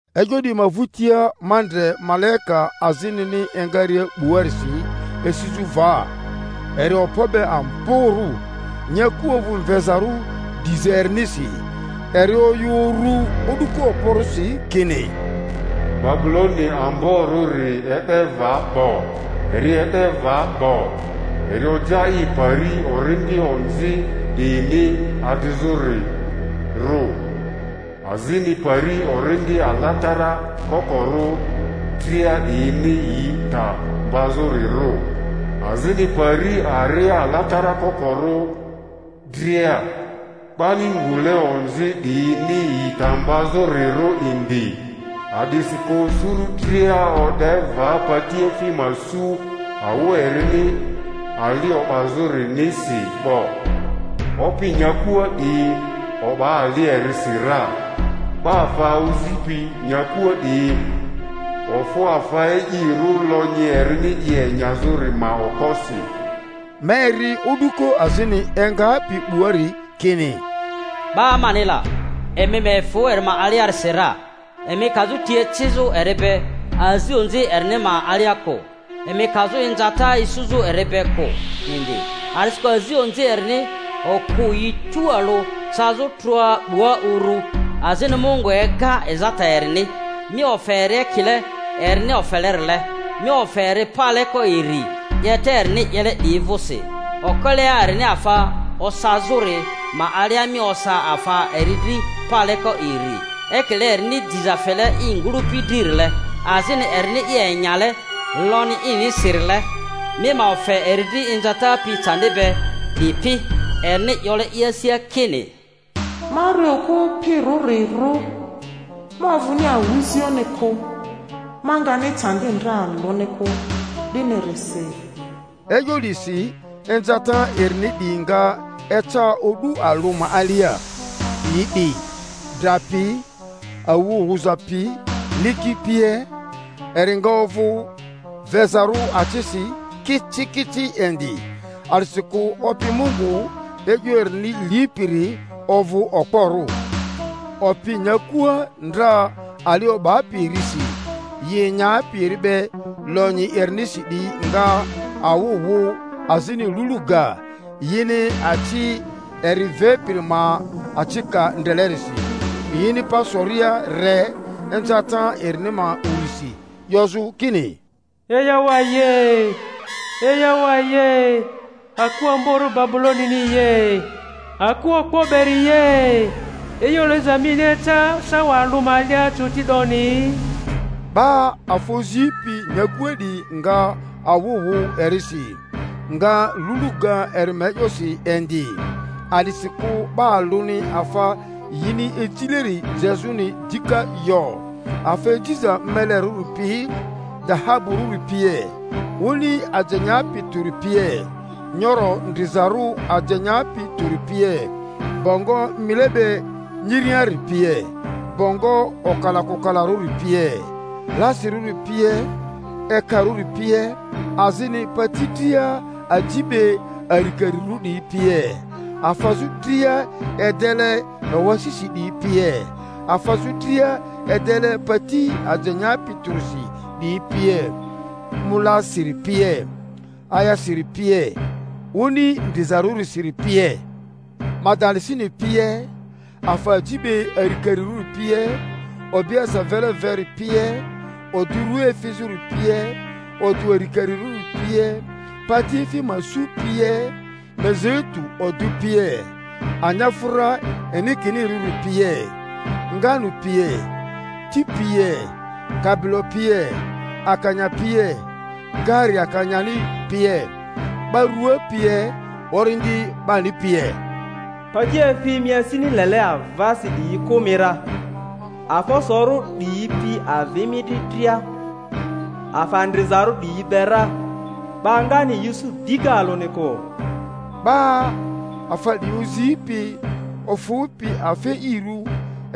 E'yo 'diyi ma vᴜtia ma ndre malaika azinini engaria 'buarisi esizᴜ va, eri okpo be amborᴜ; nyaku ovᴜ mvezarᴜ diza erinisi. Eri oyᴜ uru o'duko okporᴜsi kini, Babuloni amborᴜri e'de va 'bo, eri e'de va 'bo! Eri oja i pari orindi onzi 'diyini adrizᴜrirᴜ, azini pari orindi alatara kokorᴜ dria 'diyini yi ta mbazᴜrirᴜ, azini pari aria alatara kokorᴜ dria, 'bani ngule onzi 'diyini yi ta mbazᴜrirᴜ indi; a'disikᴜ suru dria o'de va patiefi ma su awu erini ali o'bazᴜrinisi 'bo, opi nyakua 'diyi o'ba ali erisi ra, 'ba afa ozipi nyakua 'diyi ofᴜ afa e'irᴜ lonyi erini i enyazᴜri ma okposi. Ma eri o'duko azini engapi 'buari kini, Ba mani la, emi ma efᴜ eri ma aliarisi ra, emi kazᴜ ti ecizᴜ eri be azi onzi erini ma alia kᴜ, emi kazᴜ inzata isuzᴜ eri be kᴜ indi; a'disikᴜ azi onzi erini okᴜ yi tualᴜ cazᴜ trᴜa 'bua urᴜ, azini Mungu ega ezata erini. Mi ofe eri ekile erini ofelerile, mi ofe eri paleko iri 'yeta erini 'yele 'diyi vᴜsi; okelea erini afa osazᴜri ma alia mi osa afa eri dri paleko iri. Ekile erini diza fele i ngᴜlᴜpi dririle, azini erini i enyale lonyi inisirile, mi ma ofe eri dri inzata pi candi be 'dipi. Erini 'yole i asia kini, Ma ri okᴜ opirᴜrirᴜ, ma ovᴜni awᴜzioᴜni kᴜ, ma ngani candi ndre alᴜni kᴜ, 'dinirisi, e'yo 'disi inzata erini 'diyi nga eca o'du alᴜ ma alia, yi 'di: dra pi, awᴜ wuza pi, liki pie, eri nga ovᴜ vezarᴜ acisi kicikici indi; a'disikᴜ Opi Mungu e'yo erini lipiri ovᴜ okporᴜ. Opi nyakua ndra ali o'bapi erisi, yi enyapi eri be lonyi erinisi 'diyi nga awᴜ wᴜ azini lulu ga, yini aci eri vepiri ma acika ndrelerisi; yini pa soria re inzata erini ma urisi, 'yozᴜ kini, Eyawaye! Eyawaye! aku amborᴜ Babuloni ye! aku okpo beri ye! E'yo liza mini eca sawa alᴜ ma alia coti 'doni! 'Ba afa ozipi nyakua 'diyi nga awᴜ wᴜ erisi, nga lulu ga eri ma e'yosi indi, a'disikᴜ 'ba alᴜni afa yini ejileri jezᴜni dika yo; afa ejiza melerᴜri pi, dahaburᴜri pie, oni aje nyapi tᴜri pie, nyoro ndrizarᴜ aje nyapi tᴜri pie, bongo mile be nyiriari pie, bongo okalakokalarᴜri pie, lasirᴜri pie, ekarᴜri pie; azini pati dria aji be arikarirᴜ 'diyi pie, afazᴜ dria edele ewasisi 'diyi pie, afazᴜ dria edele pati aje nyapi tᴜrisi 'diyi pie, molasiri pie, ayasiri pie, oni ndrizarᴜrisiri pie; madalasini pie, afa aji be arikarirᴜri pie, obiese vele veri pie, odᴜ rua efizᴜri pie, odᴜ arikarirᴜri pie, patiefi ma su pie, mizeitu odᴜ pie, anyafᴜra inikinirᴜri pie, nganu pie, ti pie, kabilo pie, akanya pie, gari akanyani pie, 'ba rua pie, orindi 'bani pie. Patiefi mi asini lele avasi 'diyi kᴜ mi ra, afa osorᴜ 'diyi pi avi mi dri dria afa ndrizarᴜ 'diyi be ra, 'ba ngani yi isu dika alᴜni kᴜ! 'Ba afa 'diyi ozipi ofᴜpi afa e'irᴜ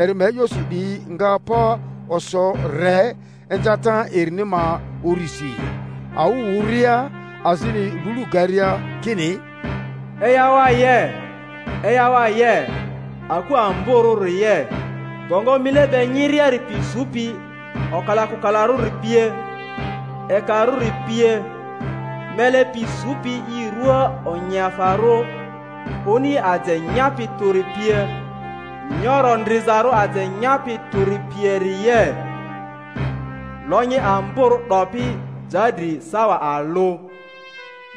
eri ma e'yosi 'diyi nga pa oso re inzata erini ma urisi, awᴜ wᴜria azini lulu garia, kini, Eyawaye! Eyawaye! aku amborᴜri ye! bongo mile be nyiriari pi supi okalakokalarᴜri pie, ekarᴜri pie, mele pi supi i ruaa onyiafarᴜ oni aje nyapi tᴜri pie, nyoro ndrizarᴜ aje nyapi tᴜri pieri ye! Lonyi amborᴜ 'dopi ja dri sawa alᴜ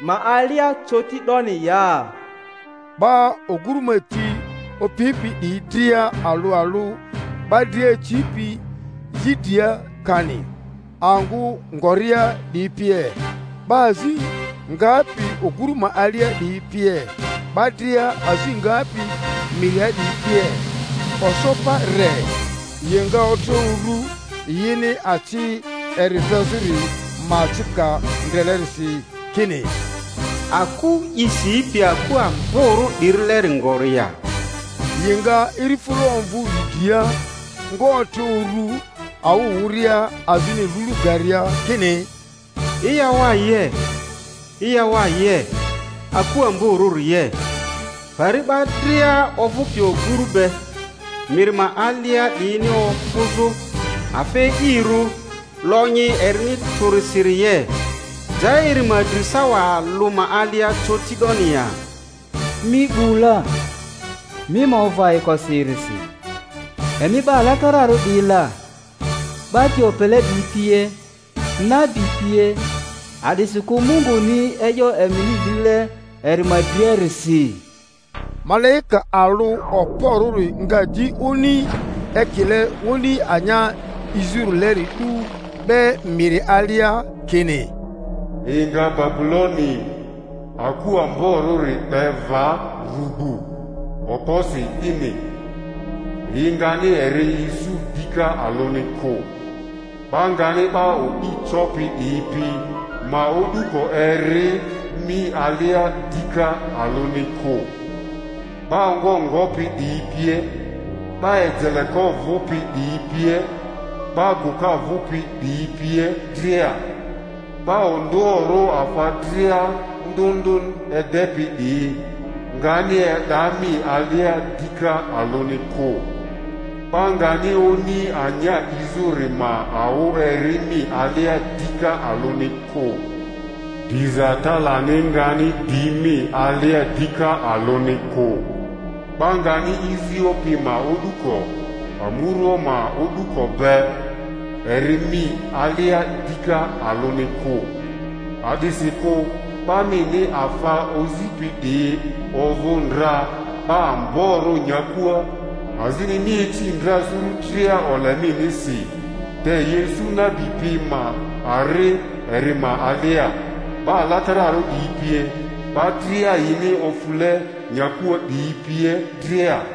ma alia coti 'doni ya! Ba oguru ma ti opipi 'diyi dria alᴜ alᴜ, 'ba dria acipi yi dria kani angᴜ ngoria 'diyi pie, 'ba azi ngapi oguru ma alia 'diyi pie, 'ba dria azi ngapi miria 'diyi pie, oso pa re, yi nga otre uru yini aci eri vezᴜri ma acika ndrelerisi, kini, Aku i sipi aku amborᴜ 'dirileri ngori ya? Yi nga irifᴜra omvᴜ yi dria, nga otre uru, awᴜ wᴜria azini lulu garia kini, Eyawaye! Eyawaye! aku amborᴜri ye! pari 'ba dria ovᴜpi oguru be miri ma alia 'diyini ofᴜzᴜ afa e'irᴜ lonyi erini tᴜrisiri ye! Ja eri ma dri sawa alᴜ ma alia coti 'doni ya! Mi 'bu la, mi ma ovᴜ ayikosi erisi, emi 'ba alatararᴜ 'diyi la, 'ba ti opele 'diyi pie, nabi pie, a'disikᴜ Munguni e'yo emini lile eri ma driarisi! Malaika alᴜ okporᴜri nga di oni ekile oni anya 'izᴜrileri 'du 'be miri alia, kini, Yi nga Babuloni, aku amborᴜri, 'be va rugbu okposi 'dini, yi ngani eri isu dika alᴜni kᴜ; 'ba ngani 'ba o'di copi 'diyi pi ma o'duko eri mi alia dika alᴜni kᴜ, 'ba ongo ngopi 'diyi pie, 'ba ejeleko vᴜpi 'diyi pie, 'ba gᴜka vᴜpi 'diyi pie dria; 'ba ondᴜoᴜrᴜ afa dria ndᴜ ndᴜ edepi 'diyi ngani e'da mi alia dika alᴜni kᴜ; 'ba ngani oni anya 'izᴜri ma awᴜ eri mi alia dika alᴜni kᴜ; diza talani ngani di mi alia dika alᴜni kᴜ; 'ba ngani izio pi ma o'duko, amurua ma o'duko be, eri mi alia dika alᴜni kᴜ; a'disikᴜ 'ba mini afa ozipi 'diyi ovᴜ ndra 'ba amborᴜ nyakua, azini mi ici ndra suru dria ole minisi. Te yi isu nabi pi ma ari eri ma alia, 'ba alatararᴜ 'diyi pie, 'ba dria yini ofule nyakua 'diyi pie dria.